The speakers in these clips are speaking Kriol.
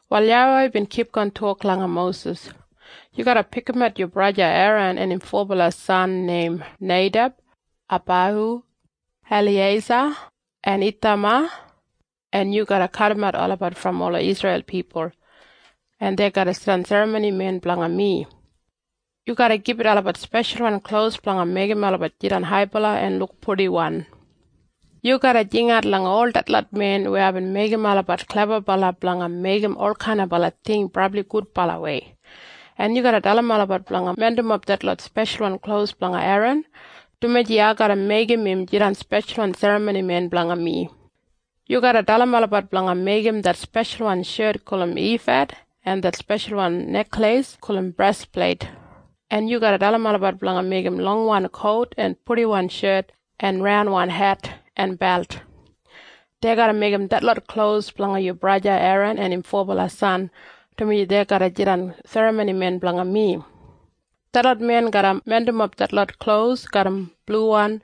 Wal YAWEI bin kipgon tok langa Mosis, “Yu garra pikimat yu braja Eran en im fobala san neim Neideb, Abaihu, Eliyeisa en Ithama, en yu garra kadimat olabat brom ola Isreil pipul, en dei garra jidan serramonimen blanga mi. Yu garra gibit olabat speshalwan klos blanga meigim olabat jidan haibala en luk purdiwan. Yu garra jingat langa ol detlot men weya aibin meigim olabat klebabala blanga meigim olkainaba ting brabli gudbalawei, en yu garra dalim olabat blanga mindimap detlot speshalwan klos blanga Eran, dumaji ai garra meigim im jidan speshalwan serramonimen blanga mi. Yu garra dalim olabat blanga meigim det speshalwan shet gulum ifad en det speshalwan nekleis gulum brespleit, en yu garra dalim olabat blanga meigim longwan kout en purdiwan shet en raunwan het en belt. Dei garra meigim detlot klos blanga yu braja Eran en im fobala san, dumaji dei garra jidan serramonimen blanga mi. Detlot men garra mindimap detlot klos garram bluwan,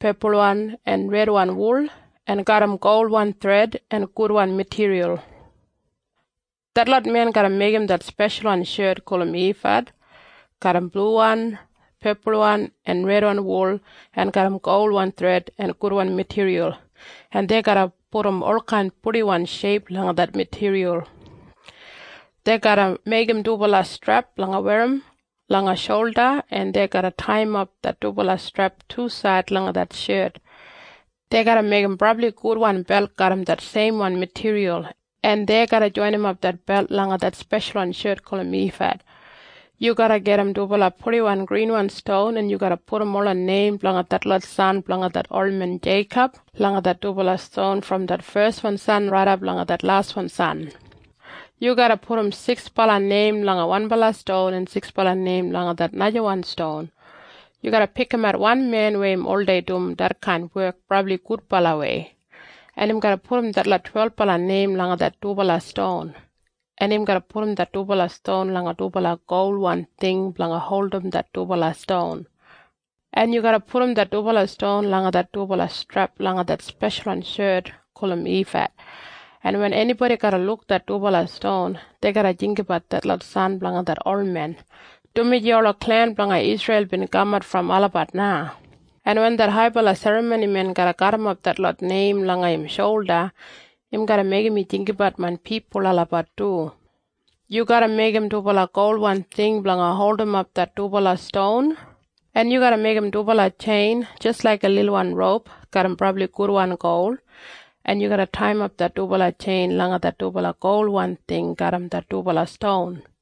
pepulwan en redwan wul en garram golwan thred en gudwan matiriyal. “Detlot men garra meigim det speshalwan shet gulum ifad garram bluwan, pepulwan en redwan wul en garram golwan thred en gudwan matiriyal, en dei garra pudum olkain purdiwan sheip langa det matiriyal. Dei garra meigim dubala strep blanga werrim langa sholda, en dei garra taiyimap det dubala strep tusaid langa det shet. Dei garra meigim brabli gudwan belt garram det seimwan matiriyal, en dei garra joinimap det belt langa det speshalwan shet gulum ifad. Yu garra gajim dubala purdiwan grinwan ston, en yu garra pudum ola neim blanga detlot san blanga det olmen Jeikob langa det dubala ston brom det feswan san raidap langa det laswan san. Yu garra pudum siksbala neim langa wanbala ston en siksbala neim langa det najawan ston. Yu garra pikimat wan men weya im oldei dum detkain wek brabli gudbalawei, en im garra pudum detlot twelbala neim langa det dubala ston, en im garra pudum det dubala ston langa dubala golwan ting blanga holdim det dubala ston, en yu garra pudum det dubala ston langa det dubala strep langa det speshalwan shet gulum ifad, en wen enibodi garra luk det dubala ston, dei garra jinggabat detlot san blanga det olmen, dumaji ola klen blanga Isreil bin kamat brom olabat na, en wen det haibala serramonimen garra garrimap detlot neim langa im sholda, im garra meigim mi jinggabat main pipul olabat du. Yu garra meigim dubala golwan ting blanga holdimap det dubala ston, en yu garra meigim dubala tjein jis laiga lilwan roup garram brabli gudwan gol, en yu garra taiyimap det dubala tjein langa det dubala golwan ting garram det dubala ston.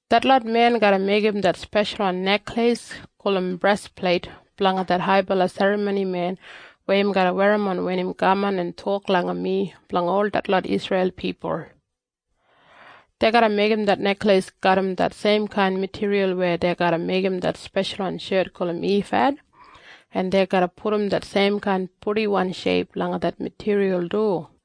“Detlot men garra meigim det speshalwan nekleis gulum brespleit blanga det haibala serramonimen weya im garra werrimon wen im kaman en tok langa mi blanga ol detlot Isreil pipul. Dei garra meigim det nekleis garram det seimkain matiriyal weya dei garra meigim det speshalwan shet gulum ifad, en dei garra pudum det seimkain purdiwan sheip langa det matiriyal du.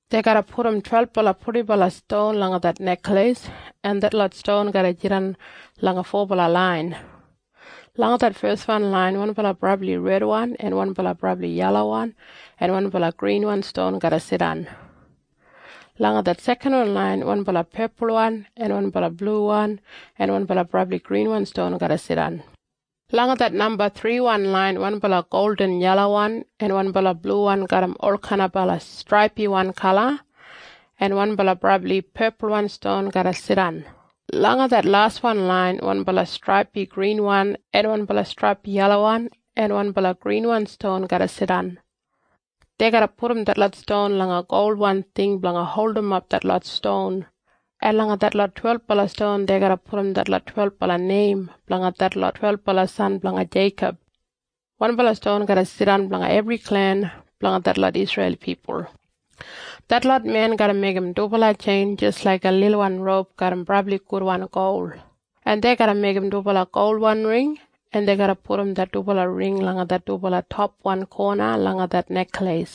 Dei garra pudum twelbala purdibala ston langa det nekleis, en detlot ston garra jidan langa fobala lain. Langa det feswan lain wanbala brabli redwan en wanbala brabli yelawan en wanbala grinwan ston garra jidan. Langa det sekanwan lain wanbala pepulwan en wanbala bluwan en wanbala brabli grinwan ston garra jidan. Langa det namba thriwan lain wanbala yelawan laiga gol en wanbala bluwan garram olkain straipiwan kala en wanbala brabli pepulwan ston garra jidan. Langa det laswan lain wanbala straipiwan grinwan en wanbala straipiwan yelawan en wanbala grinwan ston garra jidan. Dei garra pudum detlot ston langa golwan ting blanga holdimap detlot ston, en langa detlot twelbala ston dei garra pudum detlot twelbala neim blanga detlot twelbala san blanga Jeikob. Wanbala ston garra jidan blanga ebri klen blanga detlot Isreil pipul. “Detlot men garra meigim dubala tjein jis laiga lilwan roup garram brabli gudwan gol, en dei garra meigim dubala golwan ring, en dei garra pudum det dubala ring langa det dubala topwan kona langa det nekleis,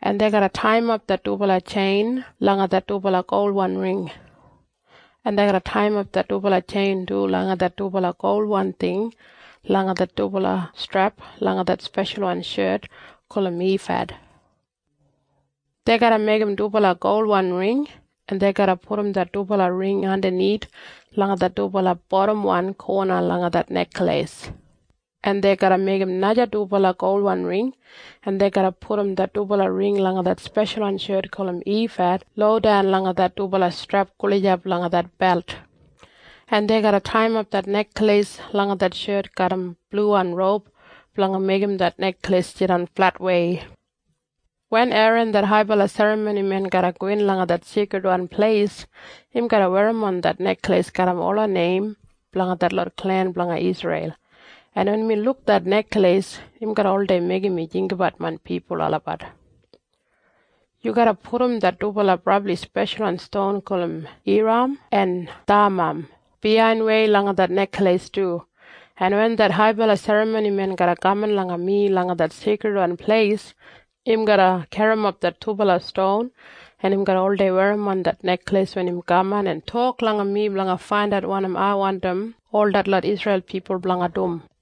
en dei garra taiyimap det dubala tjein langa det dubala golwan ring, en dei garra taiyimap det dubala tjein du langa det dubala golwan ting langa det dubala strep langa det speshalwan shet gulum ifad. Dei garra meigim dubala golwan ring, en dei garra pudum det dubala ring andanith langa det dubala bodamwan kona langa det nekleis, en dei garra meigim naja dubala golwan ring, en dei garra pudum det dubala ring langa det speshalwan shet gulum ifad lodan langa det dubala strep gulijap langa det belt, en dei garra taiyimap det nekleis langa det shet garram bluwan roup blanga meigim det nekleis jidan fletwei. “Wen Eran det haibala serramonimen garra gowin langa det Seikridwan Pleis, im garra werrimon det nekleis garram ola neim blanga detlot klen blanga Isreil, en wen mi luk det nekleis, im garra oldei meigim mi jinggabat main pipul olabat. Yu garra pudum det dubala brabli speshalwan ston gulum Yuram en Thamam biyainwei langa det nekleis du, en wen det haibala serramonimen garra kaman langa mi langa det Seikridwan Pleis, im garra garrimap det dubala ston, en im garra oldei werrimon det nekleis wen im kaman en tok langa mi blanga faindat wanim ai wandim ol detlot Isreil pipul blanga dum.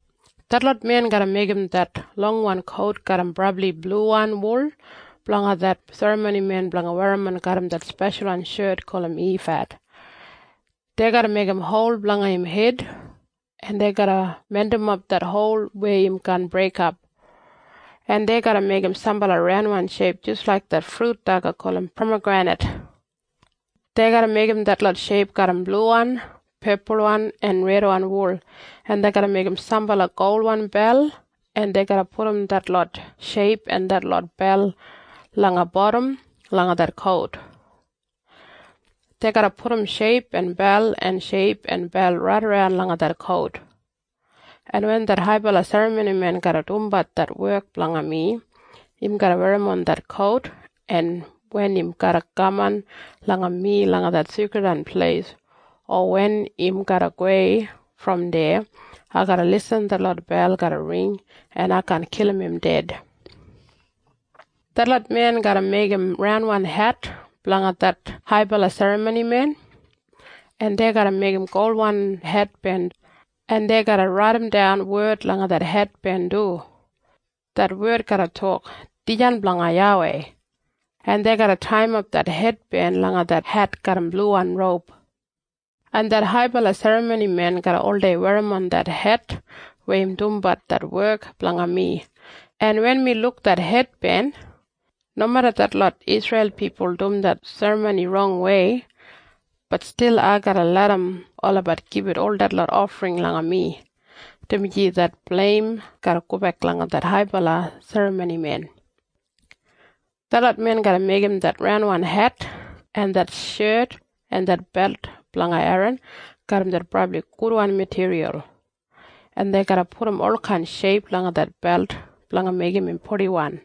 “Detlot men garra meigim det longwan kout garram brabli bluwan wul blanga det serramonimen blanga werrimon garram det speshalwan shet gulum ifad. Dei garra meigim hol blanga im hed, en dei garra mindimap det hol weya im kaan breik, en dei garra meigim sambala raunwan sheip jis laik det frut daga gulum pamagrenit. Dei garra meigim detlot sheip garram bluwan, pepulwan en redwan wul, en dei garra meigim sambala golwan bel, en dei garra pudum detlot sheip en detlot bel langa bodam langa det kout. Dei garra pudum sheip en bel en sheip en bel raidaran langa det kout, en wen det haibala serramonimen garra dumbat det wek blanga mi, im garra werrimon det kout, en wen im garra kaman langa mi langa det Seikridwan Pleis o wen im garra gowei brom deya, ai garra irrim detlot bel garra ring, en ai kaan kilim im ded. “Detlot men garra meigim raunwan het blanga det haibala serramonimen, en dei garra meigim golwan hetben, en dei garra raidimdan wed langa det hetben du. Det wed garra tok, ‘Dijan Blanga YAWEI.’ En dei garra taiyimap det hetben langa det het garram bluwan roup, en det haibala serramonimen garra oldei werrimon det het wen im dumbat det wek blanga mi, en wen mi luk det hetben, nomeda detlot Isreil pipul dum det serramoni rongwei, bat stil ai garra larram olabat gibit ol detlot ofring langa mi, dumaji det bleim garra gobek langa det haibala serramonimen. “Detlot men garra meigim det raunwan het en det shet en det belt blanga Eran garram det brabli gudwan matiriyal, en dei garra pudum olkain sheip langa det belt blanga meigim im purdiwan.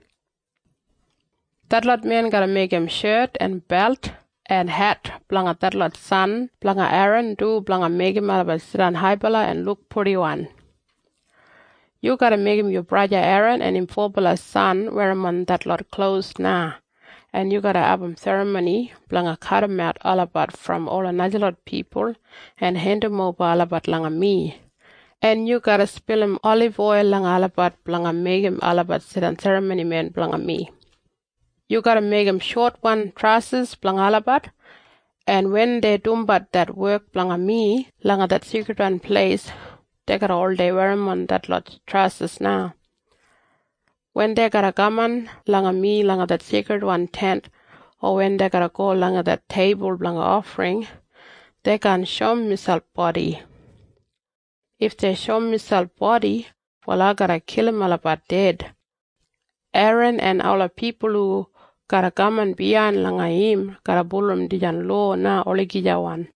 “Detlot men garra meigim shet en belt en het blanga detlot san blanga Eran du blanga meigim olabat jidan haibala en luk purdiwan. Yu garra meigim yu braja Eran en im fobala san werrimon detlot klos na, en yu garra abum serramoni blanga kadimat olabat brom ola najalot pipul en hendimoba olabat langa mi, en yu garra spilim oliboil langa olabat blanga meigim olabat jidan serramonimen blanga mi. Yu garra meigim shotwan trasis blanga olabat, en wen dei dumbat det wek blanga mi langa det Seikridwan Pleis, dei garra oldei werrimon detlot trasis na. Wen dei garra kaman langa mi langa det Seikridwan Tent o wen dei garra go langa det teibul blanga ofring, dei kaan shoum miselp bodi. If dei shoum miselp bodi, wal ai garra kilim olabat ded. Eran en ola pipul hu garra kaman biyain langa im garra bulurrum dijan lowa na olagijawan.”